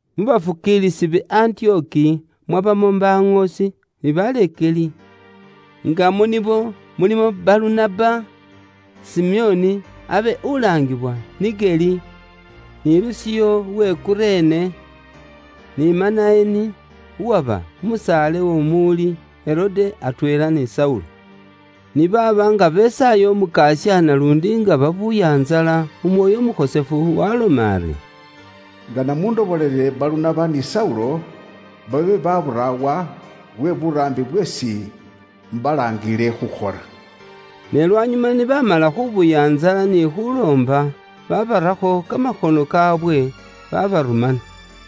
Mu bafukiilisi be Antiyoki mwabamo baŋoosi ni baleekeli, nga mu nibo mulimo Balunaba, Simeoni abe ulaangiwa Nigeli, ni Lusiyo uwe Kurene, ni Manaeni uwaba umusaale w'omuwuli Herode atweela ni Saulo. Ni baaba nga besaaya Umukasya naluundi nga babuya ntsala Umwoyo Umukhosefu waaloma ari, “Ngana mundoborere Balunaba ni Saulo, babe baburaawa lwe buraambi bweesi imbalaangiile khukhola.” Ne lwanyuma ni baamala khubuya ntsala ni khuloomba, babarakho kamakhono kaawe babarumana.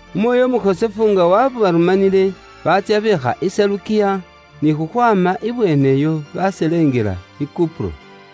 Umwoyo Umukhosefu nga waabarumanile, batsya beekha i Selukiya, ni khukhwaama ibweeneyo baselengela i Kupuro.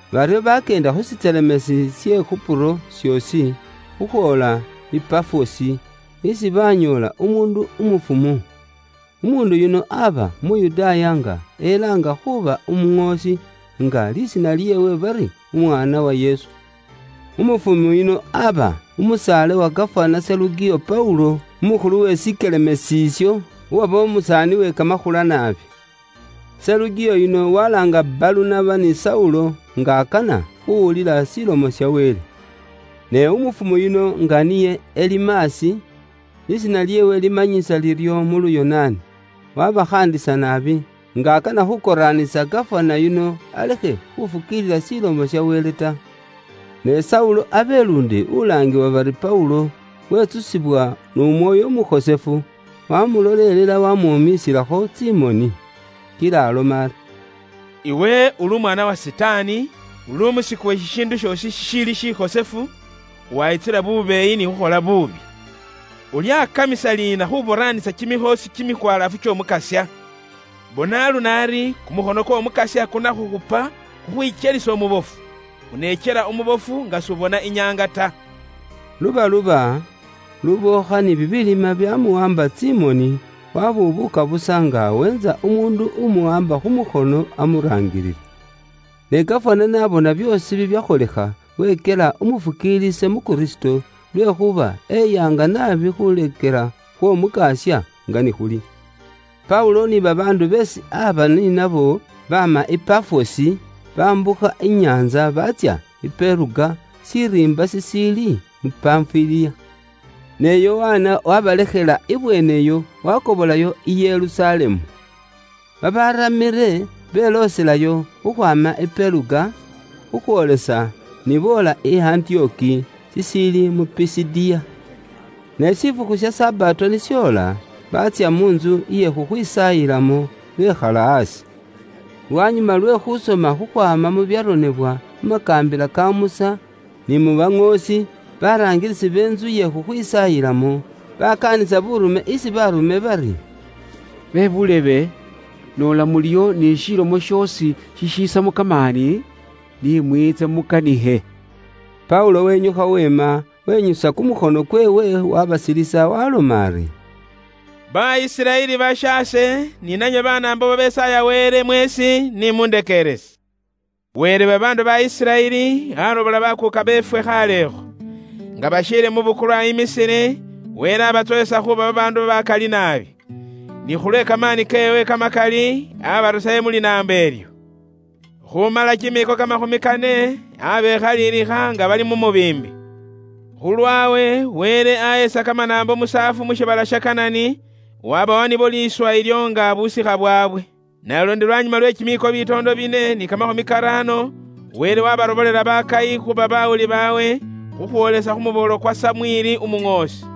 Baryo baakyeenda khu shikelemeesi she Kupuro shoosi, khukhwoola ni Pafosi, isi baanyoola umuundu umufumu. Umuundu yuno aaba Umuyudaaya nga elaanga khuuba umuŋoosi, nga lisiina lyeewe bari Umwaana-Wa-Yesu. Umufumu yuno aaba musaale wa gafana Serugiyo Paulo umukhulu we shikelemeesi isho, uwaba umusaani we kamakhula naabi. Serugiyo yuno walaanga Balunaba ni Saulo nga akana khuuwulila Ilomo ya Wele. Ne umufumu yuno nga niye Elimasi (lisiina lyeewe limanyisa liryo mu Luyonaani), waabakhaandisa naabi, nga akana khuukoraanisa gafana yuno alekhe khufukiilila Ilomo ya Wele ta. Ne Saulo abe luundi ulaangibwa bari Paulo, wetsusibwa n'Umwoyo Umukhosefu, waamulolelela, waamwomiisilakho tsimoni. Kila aloma ari, “Iwe uli umwaana wa Sitaani, uli umusiku we shishiindu shoosi shishiili shikhosefu, wayitsula bubeeyi ni khukhola buubi! Ulyakamisa liina khuboraanisa kimikhoosi kimikwalaafu ky'Omukasya? Bona aluno ari, kumukhono kw'Omukasya kunakhukhupa, kukhwikyelise umubofu. Unekyela umubofu nga s'ubona inyaanga ta.” Lubaluba, lubookha ni bibilima bya muwaamba tsimoni, wabubuuka busa nga aweentsa umuundu umuwaamba khu mukhono amuraangilile. Ne gafana n'abona byoosi bibyakholekha, wekyela umufukiilisi mu Kristo, lwekhuuba eyaanga naabi khuleekela khw'Omukasya nga ni khuli. Paulo ni babaandu beesi aaba ni nabo, baama i Pafosi, baambukha inyaantsa baatsya i Peruga shiriimba shishiili mu Panfiliya. Ne Yokana abe lisiina lyeewe liliindi bari Mako wabalekhela ibweeneyo wakobolayo i Yerusalemu. Babaaramile belooselayo khukhwaama i Peruga, khukhwoolesa ni boola i Antiyoki shishiili mu Pisidiya. Ne shifukhu sha Sabato ni shoola, baatsya mu ntsu iye khukhwisaayilamo, bekhala aasi. Lwanyuma lwe khusoma khukhwaama mu bibyaronebwa mu makaambila ka Musa ni mu baŋoosi, baraangilisi be ntsu ye khukhwisaayilamo, bakaanisa buurume isi baarume bari, “Bebuulebe, noola muliyo ni shilomo shoosi shishisamo kamaani, ni mwiitse mukanikhe.” Paulo wenyukha weema, wenyusa kumukhono kweewe waabasilisa waaloma ari: “Ba Isiraeli bashaase ni nanywe Banaambo babesaaya Wele mweesi ni mundekeerese. Wele we babaandu ba Isiraeli aarobola bakuuka beefwe khaalekho. Nga bashiili mu bukulwa mu liloba lye ba Misiri, Wele aabatsowesa khuuba babaandu bakali naabi. Ni khulwe kamaani keewe kamakali aabarusayo mu linaambo ilyo. Khuumala kimiiko kamakhumi kane, abekhaliliikha nga bali mu mubiimbi. Khulwawe, Wele ahesa kamanaambo musaafu mu shiibala sha Kanani, wabawa nibo liiswa ilyo nga busikha bwaabwe. Sam 3.20Naluundi lwanyuma lwe kimiiko bitoondo bine ni kamakhumi karaano, Wele wabarobolela bakayi khuuba bawuli baabwe khukhwoolesa khu muboolo kwa Samweli umuŋoosi.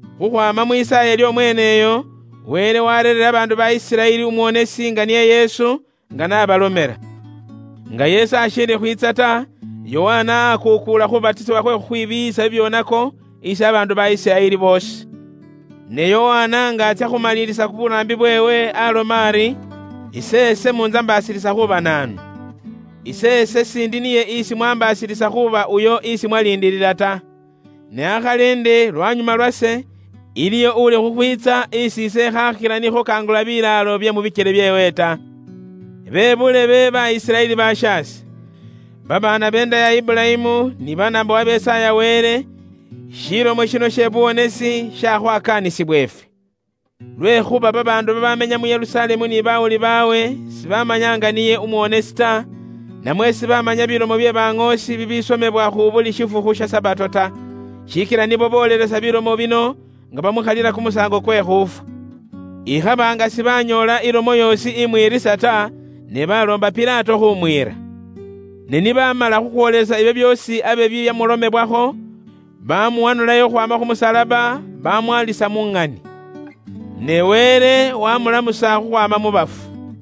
Khukhwaama mwisaaye ly'omweeneyo, Wele warereera babaandu ba Isiraeli umuwonesi nga niye Yesu, nga n'abalomela. Nga Yesu ashiili khwiitsa ta, Yokana aakuukuula khuubatisibwa khwe khukhwibiiyisa bibyoonako isi babaandu ba Isiraeli boosi. Ne Yokana nga atsya khumalilisa buraambi bweewe aaloma ari, ‘Iseese muntsambaasilisa khuuba naanu? Iseese siindi niye isi mwaambasilisa khuuba uyo isi mwaliindilila ta. Ne akhali ndi lwanyuma lwase, iliyo uli khukhwiitsa isi ise ikhaakhila ni khukangulula bilaalo bye mu bikyele byeewe ta.’ “Bebuulebe, ba Isiraeli bashaase, babaana beenda ya Iburayimu ni Banaambo babaarya Wele, shilomo shino she buwonesi shakhwakaanisibwa ifwe. Lwekhuuba babaandu babamenya mu Yerusalemu ni bawuli baabwe, sibamanya nga niye umuwonesi ta, namwe sibamanya bilomo bye baŋoosi bibisomebwa khu buli shifukhu sha Sabato ta. Shikila nibo boolelesa bilomo bino nga bamukhalila kumusaango kwe khuufwa. Ikhaba nga sibanyoola ilomo yoosi imwiriisa ta, ne baloomba Pilato khumwiira. Ne ni baamala khukhwoolelesa ibyo byoosi abe bibyamulomebwakho, bamuwanulayo khukhwaama khu musalaba bamwalisa mu ŋani. Ne Wele wamulamusa khukhwaama mu bafu.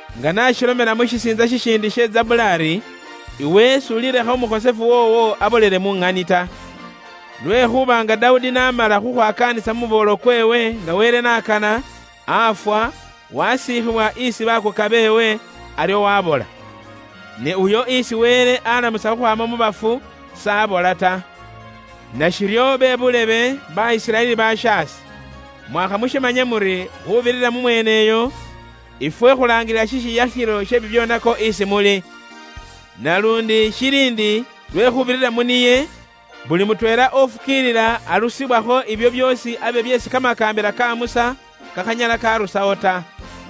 Nga makiboole n'ashilomela mu shisiintsa shishiindi she Zabuli ari, ‘Iwe s'ulilekha umukhosefu woowo abolele mu ŋani ta.’ “Lwekhuuba nga Dawudi n'amala khukhwakaanisa mu muboolo kweewe nga Wele n'akana, afwa, wasiikhiwa isi bakuuka beewe, aryo wabola. Ne uyo isi Wele alamusa khukhwaama mu bafu s'abola ta. “Nashiryo be buulebe, ba Isiraeli bashaase, mwakha mushimanye muri, khuubirira mu mweene uyo, ifwe khulaangilila shishiyakhilo she bibyoonako isi muli. Naluundi shili ndi lwe khuubirira mu niye, buli mutweela ufukiilila arusibwakho ibyo byoosi abe byeesi kamakaambila ka Musa kakhanyala karusawo ta.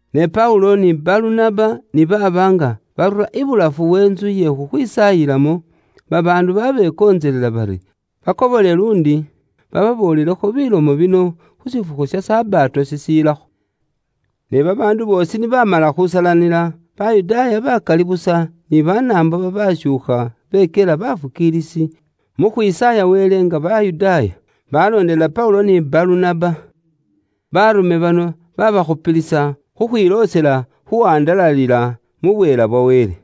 Ne Paulo ni Balunaba ni baaba nga barura ibulafu we ntsu iye khukhwisaayilamo, babaandu babekontselelela bari bakobole luundi bababoolelekho bilomo bino khu shifukhu sha Sabato shishilakho. Ne babaandu boosi ni baamala khusalanila khukhwaama muntsu iye khukhwisaayilamo, Bayudaaya bakali busa ni Banaambo babashuukha bekyela bafukiilisi mu khwisaaya Wele nga Bayudaaya, baloondelela Paulo ni Balunaba. Baarume bano babaakhupilisa khukhwiloosela khuwandalalila mu bweela bwa Wele.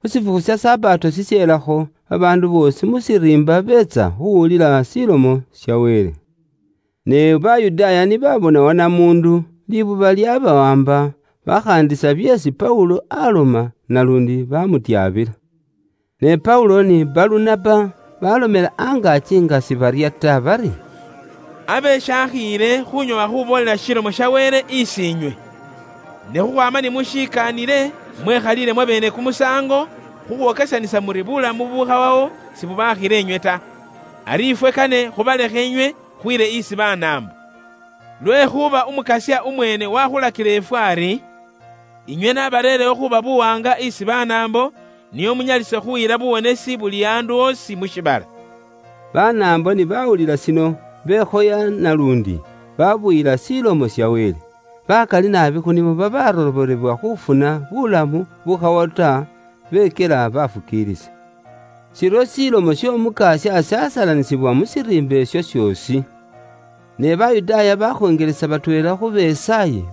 Khu shifukhu sha Sabato shisheelakho, babaandu boosi mu shiriimba beetsa khuuwulila Ilomo ya Wele. Ne Bayudaaya ni baabona wanamuundu, libuba lyaabawaamba, bakhaandisa byeesi Paulo aloma, naluundi baamufwotsola. Ne Paulo ni Balunaba baalomela angaaki nga sibarya ta bari, “Abe shaakhiile khunyoowa khuboolela Ilomo ya Wele isi inywe. Ne khukhwaama ni mushikaanile, mwekhaliile mwabeene kumusaango khukhwokesanisa muri bulamu bubukhawawo sibubakhila inywe ta. Ari ifwe kane khubalekhe inywe khwiile isi Banaambo. Lwekhuuba Umukasya umweene wakhulakila ifwe ari, ‘Inywe nabareerewo khuuba buwaanga isi Banaambo, nio munyalise khuyila buwonesi buli andu osi mu shiibala.’” Banaambo ni baawulila shino, bekhoya naluundi baabuyila Ilomo ya Wele. Bakali naabi khu nibo babaarobolebwa khuufuna buulamu bukhawawo ta, bekyela baafukiilisi. Shiryo Ilomo y'Omukasya yaasalanisibwa mu shiriimba isho shoosi. Ne Bayudaaya bakhonjelesa batweela khu besaayi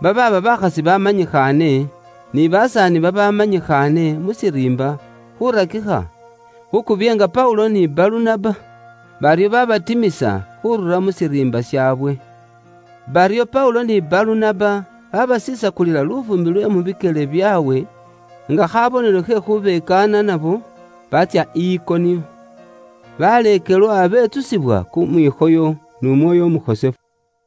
babaaba bakhasi babamanyikhaane, ni basaani babamanyikhaane mu shiriimba, khurakikha khukubyeenga Paulo ni Balunaba. Baryo babatimisa khurura mu shiriimba shaawe. Baryo Paulo ni Balunaba baabasisakulila lufuumbi lwe mu bikyele byaabwe nga khabonelo khe khubekaana nabo, baatsya i Ikoniyo. Baleekelwa betsusibwa kumwikhoyo n'Umwoyo Umukhosefu.